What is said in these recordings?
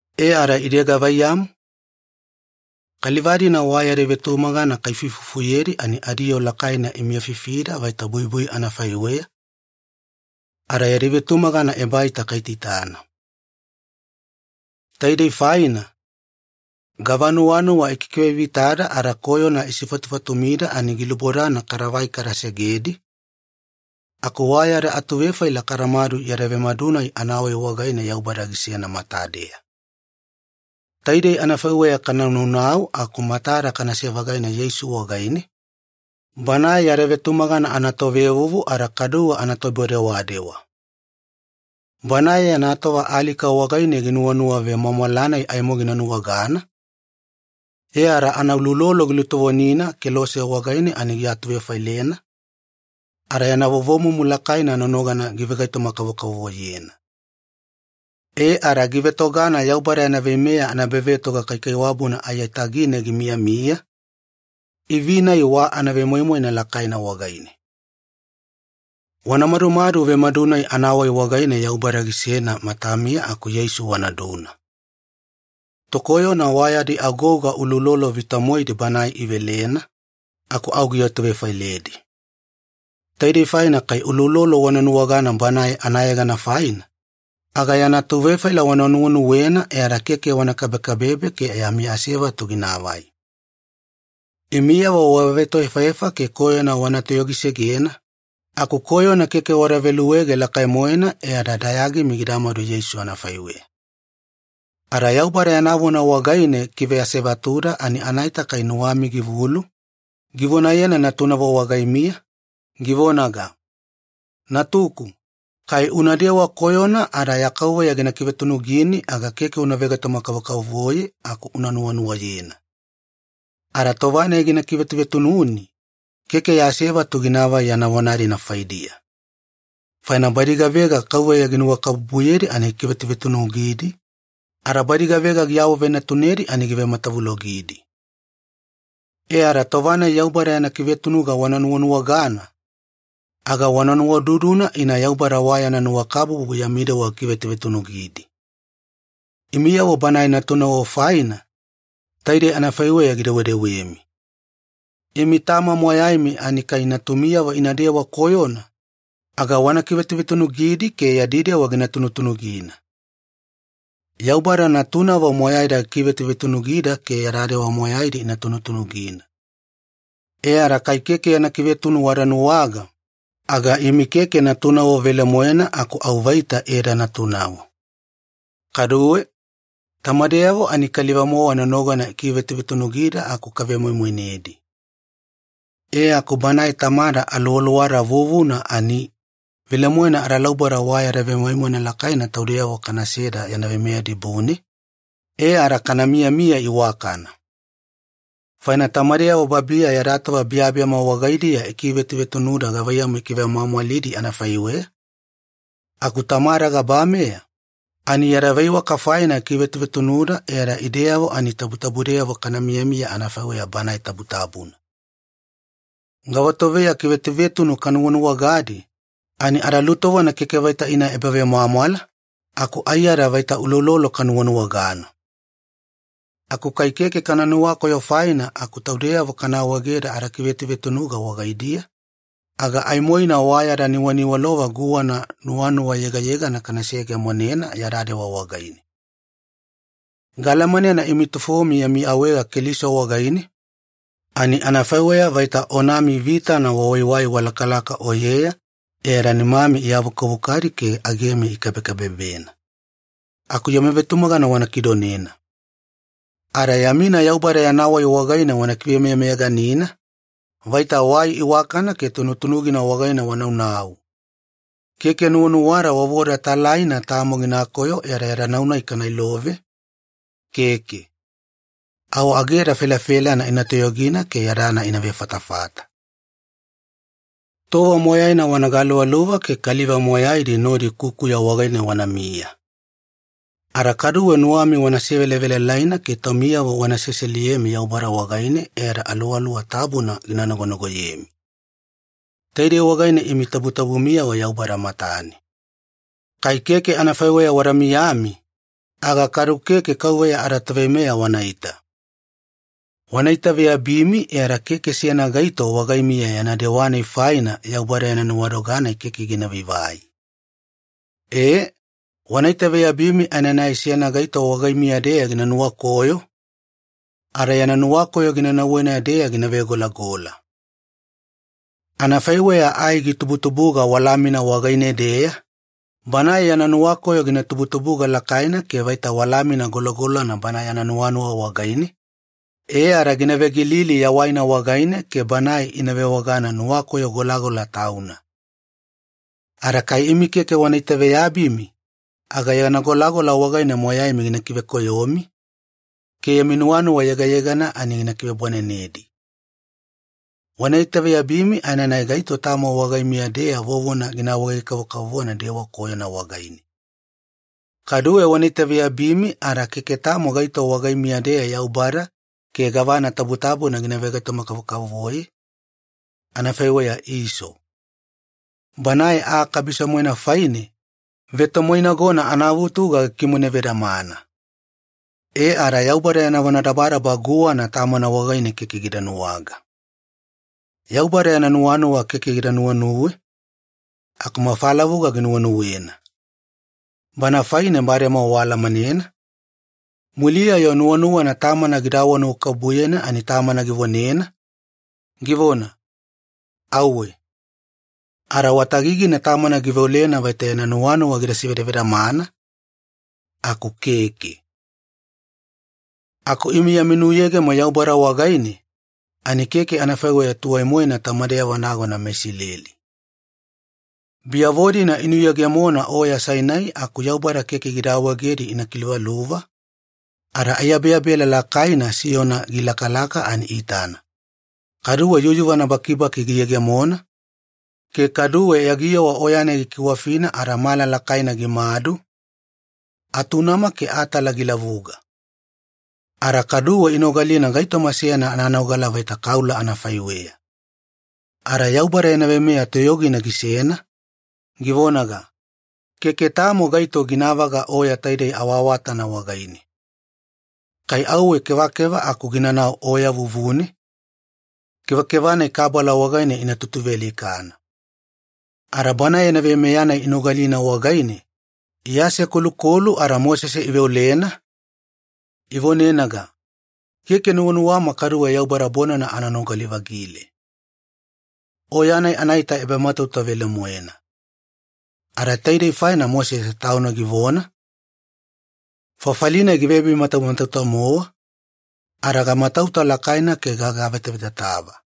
E ada ide gavaiyamu? Kaliva-dina wa yadi vetumagana kaifuifufuyedi ani adiyoo lakaina imiyafifida vaita buibui anafaiweya, ada yadi vetumagana ebaita kaitaitana. Taidei faina, gava nuwanuwa ikikivevitada ada koyona isifatufatumida ani gilubodana kadavai kada segedi, aku wa yada atuvefaila kadamadu yada vemadu-nai anawai wagaine Yaubada gisena matadeya. Taidei anafaiweya kana naunau aku matada kanase-vagaina Yeisu wagaine, Banae yada vetumagana anatovevuvu ada kaduwe anatoibodewadewa. Banae yana tova alika wagaine ginuwanuwa vemwamwala-nai aimo gina nuwagana, e ada anauloulolo gilutovonina kelose wagaine ani giatuvefailena, ada yana vovomumu lakaina nonogana givegaitoma-kavokavovoyena. E ada givetogana Yaubada yana veimeya anaebavetoga kaikaiwabuna aiyatagine gimiyamiya, ivi-nai wa anavemoimoina lakaina wagaine. Wana madumadu vemadu-nai anawai wagaine Yaubada gisena matamiya aku Yeisu wanaduna. Tokoyona wa yadi agouga uloulolo vita-moedi Banae ivelena, aku au giatuvefailedi. Taidei faina kai uloulolo wana nuwagana Banae anayegana faina, aga yana atuvefaila wana nuwenuwena e ada keke wana kabekabebe ke yami asevatu ginaavai. Imiyavo wavetoefaefa ke koyona wana toyogisegena, aku koyona keke wada veluege lakai-moena e ada dayagimi gidamadu Yeisu anafaiweya. Ada Yaubada yana vona wagaine gikive asevatuda ani anaita kai nuwami givulu, givonayena natunavo wagaimiya, givonaga, “Natuku, kai unadewa koyona ada ya KAUVEYA gina kivetunugini, aga keke una vegaitoma-kavokavovoye aku una nuwanuwayena. Ada tova-nai gina kivetuvetununi, keke ya asevatu ginaavai yana vona-dina faidiya. Faina badi gavega KAUVEYA ginuwakabubuyedi ani gikivetuvetunugidi, ada badi gavega giawavenatunedi ani givematavulogidi.” E ada tova-nai Yaubada yana kivetunuga wana nuwanuwagana, aga wana nuwaududuna ina Yaubada wa yana nuwakabubu yami dewa gikivetuvetunugidi. Imiyavo Banae natunavo faina, taidei anafaiweya gidewedewemi. Imi tama moyaimi ani kai natumiyavo inadewa koyona, aga wana kivetuvetunugidi ke yadi dewa gina tunutunugina. Yaubada natunavo moyaida gikivetuvetunugida ke yada dewa moyaidi ina tunutunugina. E ada kai keke yana kivetuvetunu wada nuwaga, aga imi keke natunavo velemoena aku au vaita edanatunavo. Kaduwe, tamadeyavo ani kaliva-mowa nonogana ikivetuvetunugida aku kavemoimoinedi. E aku Banae Tamada aluwaluwada vuvuna ani, velemoena adalauboda wa yada vemoimoina lakaina taudeyavo kana seda yana veimeya dibune, e ada kana miyamiya iwakana. Faina tamadeyavo babiya yada tova biyabiyama wagaidiya ikivetuvetunuda gavaiyamu ikivemwamwalidi anafaiweya, aku Tamada gabameya, ani yada veiwaka faina gikivetuvetunuda e ada ideyavo ani tabutabudeyavo kana miyamiya anafaiweya Banae tabutabuna. Gavatoveya kivetuvetunu kanuwanuwagadi, ani adalutovona keke vaita ina ebavemwamwala, aku aiyada vaita uloulolo kanuwanuwagana. Aku kai keke kana nuwakoyo faina aku taudeyavo kana awaegeda adakivetuvetunuga wagaidiya, aga aimoina wa yada nuwaniwalova guwana nuwanuwa yegayegana kana seyegemonena yada dewa wagaine. Gaalamanena imi tufomi yami awaega Keliso wagaine, ani anafaiweya vaita onami vitana wawaiwai walakalaka oyeya e ada nimami iavukavukadi ke agemi ikabekabebena. Aku yami vetumagana wana kidonena. Ada yamina Yaubada yana wai wagaine wana kivemeyameyaganina, vaita wai iwakana ke tunutunugina wagaine wana naunau. Keke nuwanuwada vovoda talaina tamo ginakoyo e ada yada nau-nai kana ilove, keke. Au ageda felafelana ina toyogina ke yadana ina vefatafata. Tova moyaina wana galuvaluva ke kaliva moyaidi nodi kukuya wagaine wanamiya. Ada kaduwe nuwami wana sevelavelalaina ke taumiyavo wana seseliyemi Yaubada wagaine e ada Aluwaluwa Tabuna gina nagonagoyemi. Taidei wagaine imi tabutabumiyavo Yaubada matane. Kai keke anafaiweya wada miyami, aga kadu keke Kauveya adaToveimeya wanaita. Wana itaveyabimi e ada keke seyana gaito wagaimiya yana dewa faina Yaubada yana nuwadoga-nai keke gina vaivai. Ee, wana itaveyabimi aenanai seyana gaito wagaimiya-deya gina nuwakoyo, ada yana nuwakoyo gina nauwena-deya gina vegolagola. Anafaiweya ai gitubutubuga walamina wagaine-deya, banae yana nuwakoyo gina tubuga lakaina ke vaita walamina golagolana bana yana nuwanuwa wagaine, e ada gina vegilili yawaina wagaine ke banae ina vewagana ‘nuwakoyo golagola tauna’. Ada kai imi keke wana itaveyabimi, aga yana golagolana wagaine moyaimi gina ivekoyomi, ke yami nuwanuwa yegayegana ani gina kivebwanenedi. Wana itaveyabimi aenanai gaito tamo wagaimiya-deya vovona gina awaege kavokavovo dewa koyona wagaine. Kaduwe wana itaveyabimi ada keke tamo gaito wagaimiya-deya Yaubada ke gavana tabutabuna gina vegaitoma-kavokavovoye, anafaiweya Iso. Banae aa kabiso-moena faine, vetomoinagona anavutuga gikimone vedamana. E ada Yaubada yana vonadabadaba guwana tamana wagaine keke gida nuwaga. Yaubada yana nuwanuwa keke gida nuwenuwe, aku mafa lavuga ginuwenuwena. Bana faine bademowa waalamanena, muliya-yo nuwanuwana tamana gida awanuwakabubuyena ani tamana givonena, givona, “Auwe.” Ada wa tagigina tamana giveolena vaita yana nuwanuwa gida sivedavedamana, aku keke. Aku imi yami nuyegemo Yaubada wagaine, ani keke anafaiweya tuwai-moena tamadeyavo nagona meIsileli. Biyavo-dina inuyegemona Oya Sainai aku Yaubada keke gida awaegedi ina kiluvaluva, ada aiyabeyabela lakaina siyona gilakalaka ani iitana, kaduwe yuyuvana bakibaki giyegemona, ke kaduwe yagiyowa Oya-nai gikiwafina ada mala lakaina gimadu, atunama ke atala gilavuga. Ada kaduwe inogalina gaitoma seyana ananogala vaita kaula anafaiweya. Ada Yaubada yana veimeya toyogina gisena, givonaga, “Keke tamo gaito ginavaga oya taidei awaawatana wagaine. Kai auwe kevakeva aku ginanau oya vuvune, kevakeva-nai kabala wagaine ina tutuvealikana.” Ada Banae yana veimeya-nai inogalina wagaine, iasekolukolu ada Mosese iveolena, ivonenaga, “Keke nuwanuwama kaduwe Yaubada bonana ana nogali-vagile.” Oya-nai anaita ebamatauta velemoena. Ada taidei faina Mosese tauna givona, “Fafali-nai givebimatamatauta-mowa, ada gamatauta lakaina ke gagavetavetatava.”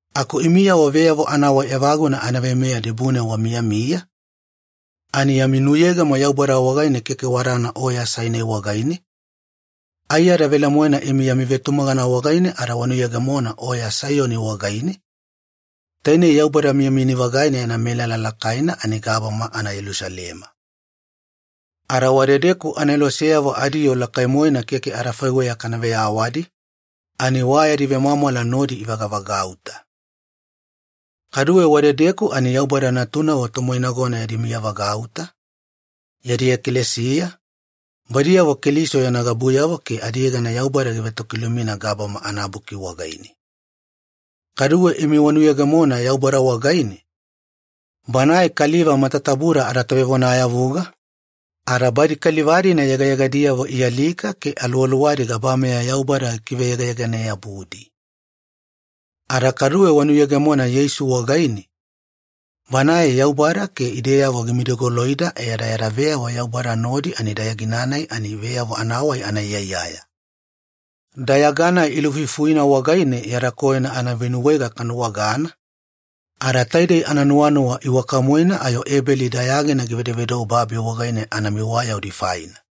Aku imiyavo veyavo anawai evaguna anaveimeya dibune wamiyamiya, ani yami nuyegemo Yaubada wagaine keke wadana Oya Sainai wagaine, aiyada velemoena imi yami vetumagana wagaine ada wanuyegemona Oya Saiyoni wagaine, tainei Yaubada miyamiyani-vagaina yana melala lakaina ani gabama anaYelusalema. Ada wadedeku aneloseyavo adiyoo lakai-moena keke adafaiweya kana veyawadi, ani wa yadi vemwamwala nodi ivagavagauta. Kaduwe wadedeku ani Yaubada natunavo tomoinagona yadi miyavagauta, yadi ekalesiya, badiyavo Keliso yana gabuyavo ke adiyegana Yaubada givetokilumina gabama anabuki wagaine. Kaduwe imi wanuyegemona Yaubada wagaine, Banae kaliva matatabuda adatovevonayavuga, ada badi kaliva-dina yegayegadiyavo ialika ke aluwaluwadi gabameya Yaubada gikiveyegayegane-yabudi. Ada kaduwe wanuyegemona Yeisu wagaine, Banae Yaubada ke ideyavo gimidigoloida e ada yada veyavo Yaubada nodi ani dayagina-nai ani veyavo anawai anaiyaiyaya. Dayaga-nai ilufuifuina wagaine yada koyona anavenuwaega kanuwagana, ada taidei ananuwanuwa iwaka-moena ayo Ebeli dayagina givedovedou babi wagaine anamiwayaudi faina.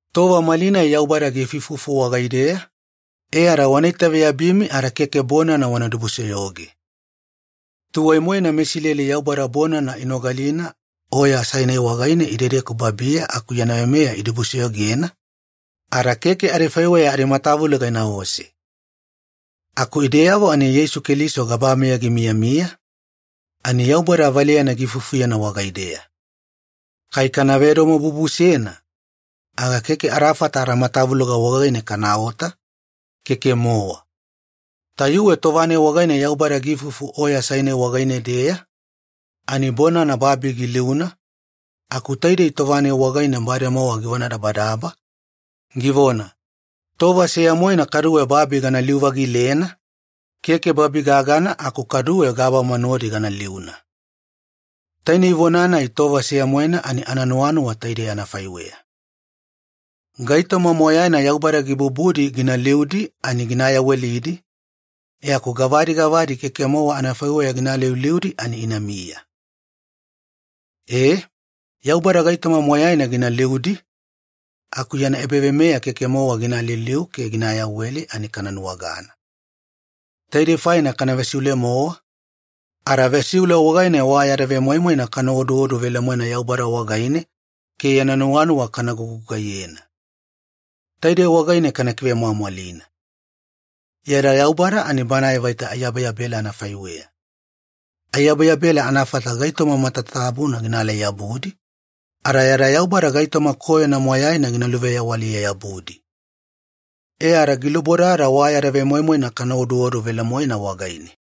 Tova malinai Yaubada giifuifufu wagaideya, e ada wana itaveyabimi ada keke bonana wana dibusoyoge. Tuwai-moena meIsileli Yaubada bonana inogalina Oya Sainai wagaine idedeku babiya aku yana veimeya idibusoyogena, ada keke adifaiweya adimatavuloga inaose. Aku ideyavo ani Yeisu Keliso gabameya gimiyamiya, ani Yaubada valeyana giifuifufuyena wagaideya. Kai kana vedomobubusena, aga keke adafata adamatavuloga wagaine kanaota, keke-mowa. Tayuwe tova-nai wagaine Yaubada giifufu Oya Sainai wagaine-deya, ani bonana babi giliuna, aku taidei tova-nai wagaine bademowa givonadabadaba, givona, “Tova seya-moena kaduwe babi gana liu-vagilena, keke babi gagana aku kaduwe gabama nodi gana liuna.” Tainei vona-nai ‘tova seya-moena’ ani ananuwanuwa taidei anafaiweya. Gaitoma moyaina Yaubada gibubudi gina liudi ani gina yawelidi, e aku gavadi gavadi keke-mowa adifaiweya gina aliuliudi ani inamiya. E, Yaubada gaitoma moyaina gina liudi, aku yana ebaveimeya keke-mowa gina aliuliu ke gina ayaweli ani kana nuwagana. Taidei faina kana vesivesiule-mowa, ada vesiule wagaine wa yada vemoimoina kana oduodu velemoena Yaubada wagaine ke yana nuwanuwa kana gugugaiyena. Taidei wagaine kana kivemwamwalina. Yada Yaubada ani Banae vaita aiyabeyabela anafaiweya. Aiyabeyabela anafata gaitoma matatabuna ginaalai-yabudi, ada yada Yaubada gaitoma koyona moyaina gina luveyawaliye-yabudi. E ada gilubodada wa yada vemoimoina kana oduodu velemoena wagaine.